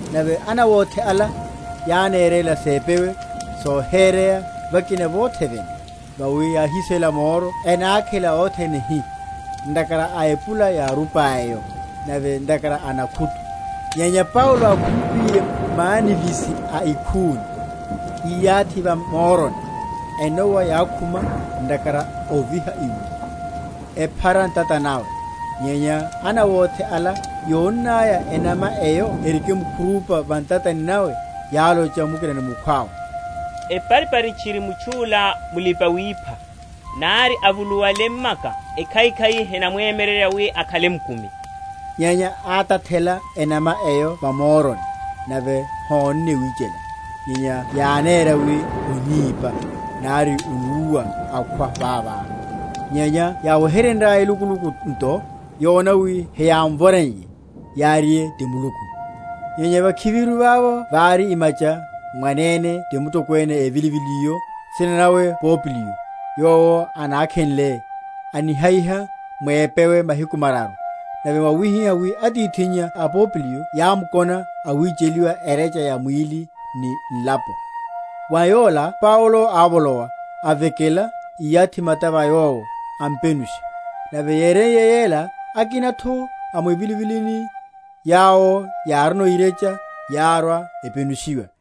Nave anawothe ala yánerela sepewe sohereya vakina vothe vene’vo; vawi yáhisela moro, enákhela othene hi, ntakhara a epula yárupa eyo, nave ntakhara a nakhutu. Nyenya Paulo ákhumpiye mwanivisi a ikhuni, íyathi va moroni, enowa yákhuma, ntakhara a oviha iwo, ephara ntata nawe. Nyenya anawothe ala yónnaya enama eyo erikimkhurupa va ntatani nawe, yálocha mukina ni mukhwawe, Eparipari tchiri mutchu’la mulipa‐wipha, nari avuluwale m’maka, ekhaikhai henamwemyererya wi akhale mukumi. Nyenya átathela enama eyo va moroni, nave hónne wichela. Nyenya yánéra wi onípa, nari onúwa akhwa vavo; nyenya yáwehenryaya elukuluku nto, yona wi heyámvoreiye, yáriye, Ti Muluku. Nyenya vakhiviru vavo vári imacha, mwanene ti mutokwene evilivili’yo, nsina nawe Popliyo; yowo ánakhenle, anihayiha mwepewe mahiku mararu. Nave wáhihihá wi atithinnya a Popliyo yámkona awicheliwa erecha ya mwíli ni nlapo. Wa yola Paulo ávolowa, avekela, íyathi mata va yowo, ampenusha. Nave yéreiye ela, akina’tho a mwivilivilini, yawo yárino irecha, yárwa, epenushiwa;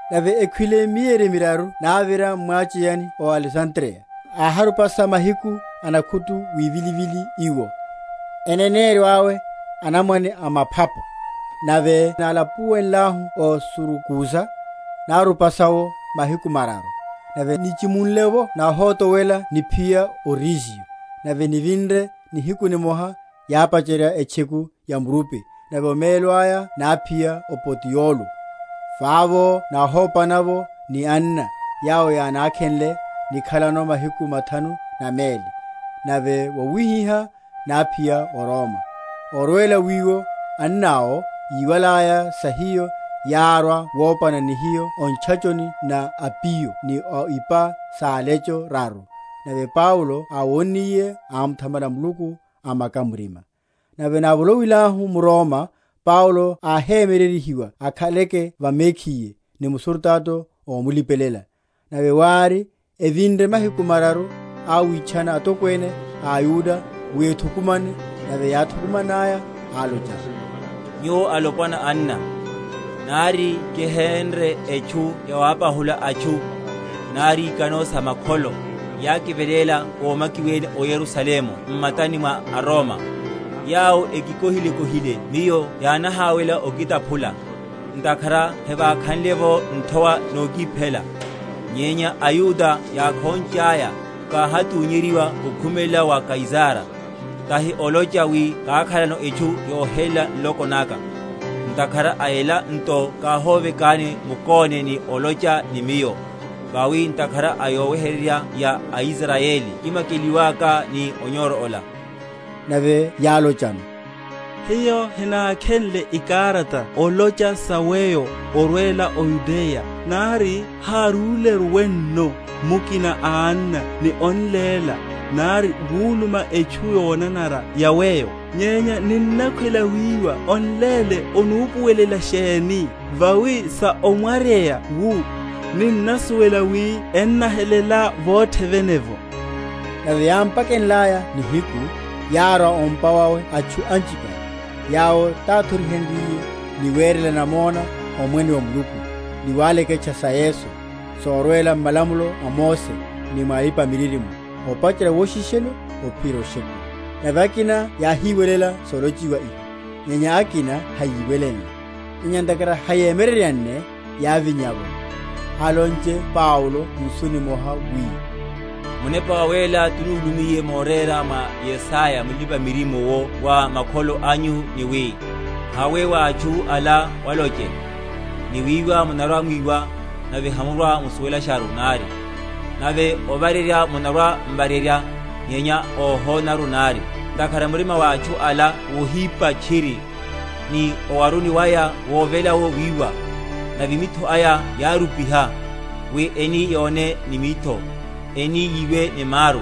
Nave ekhwile mieri miraru návira m’mwacheyani ó Alesandriya, áharupasa mahiku a nakhutu wivilivili iwo, eneneryo awe, Anamwane a maphapo. Nave nálapuwenlahu o Surakusa, nárupasa’wo mahiku mararu. Nave nichimunle’vo náhotowela niphiya o Regio; nave nivinre nihiku nimoha yápacherya etcheku ya murupi, nave omelo aya náphiya o Potiyolo; vavo náhopana’vo ni anna, yawo yánákhenle nikhalano mahiku mathanu na meli; nave vawihihá náphiya o Roma. Orwela wiwo anna’wo, yíwalaya sa hiyo, yárwa wopana ni hiyo o Ntchachoni na Apiyo ni o Ipa sa Alecho raru; nave Paulo áwonniye, ámuthamala Muluku, amaka murima. Nave návolowilahu m’Roma, Paulo áhemyereryiwa akhaleke va mekhiye ni musurutato ómulipelela. Nave wári, evinre mahiku mararu, áwitchana atokwene a aYuda wi ethukumane; nave yáthukumannaya, álochano, Nyuwo, alopwana, anna, nari kihénre etchu yawapahula atchu, nari ikano sa makholo, yákiveléla ómakiwene o Yerusalemu m’matani mwa aRoma: yawo ekikohilekohile miyo yánahawela okitaphula, ntakhara hevákhanle’vo nthowa nokiphela. Nyenya aYuda yákhonchaya, káhathunyeryiwa okhumelela wa Kaisara; tahi olocha wi kákhalano etchu yohelela nloko naka. Ntakhara a ela nto káhovekani mukóne ni olocha ni miyo; vawi ntakhara a yoweheryerya ya Israyeli kimakiwelaka ni onyoro ola. Nave yálochano, Hiyo henákhenle ikarata olocha sa weyo orwela o Yudeya, nari hárúleru wenno mukina a anna ni on’léla nari wuluma etchu yonanara ya weyo. Nyenya ninnakhwela wiwa on’léle onupuwelela sheni; vawi sa omwaryeya wu, ninnasuwela wi ennahelela vothe vene’vo. Nave yámpakenlaya nihiku, yárwa o’mpa wawe atchu anchipale; yawo táthorihenryiye, ni werela namona omwene wa Muluku, ni waleketcha sa Yesu, sorwela m’malamulo a Mose ni mwa alipa‐miririmo, opacherya woshishelo ophiyerya oshekuwa. Nave akina yáhiwelela solochiwa iho, nyenya akina hayíwelenle. Nyenya ntakhara hayémyereryanne, yávinya’vo, alonche Paulo nsu nimoha, wi, Munepa Wawéla túlummiye morera mwa Yesaya mulipa‐miririmo’wo wa makholo anyu, ni wi. Hawe wa atchu ala, waloche, Ni wiwa munarwa‐mwiwa, nave hamurwa‐musuwelasharu nari; Nave ovarerya munarwa‐m’varerya, nyenya óhonaru nari; Ntakhara murima wa atchu ala wohipa tchiri, Ni owaruni waya wovela’wo wiwa, Nave mitho aya yárupiha; Wi eni yone ni mitho, Eni yiwe ni maru,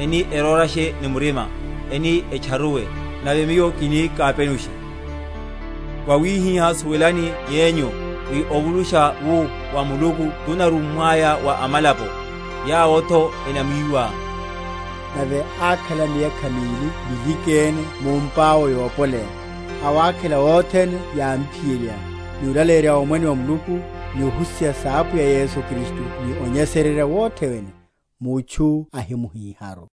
Eni erórashe ni murima, Eni etcharuwe, Nave Miyo kini kapenushe. Vawihihá, suwelani yenyu, wi ovulusha wu wa Muluku tunarummwaya wa amalapo; yawo’tho enamwiwa. Nave ákhala miyakha mili milikene mu’mpa awe yopoleya, awákhela othene yámphiyerya, ni olaleyerya omwene wa Muluku, ni ohusiha sa Apwiya Yesu Kristu ni onyesererya wothe wene, mutchu ahina?-?muhíharu.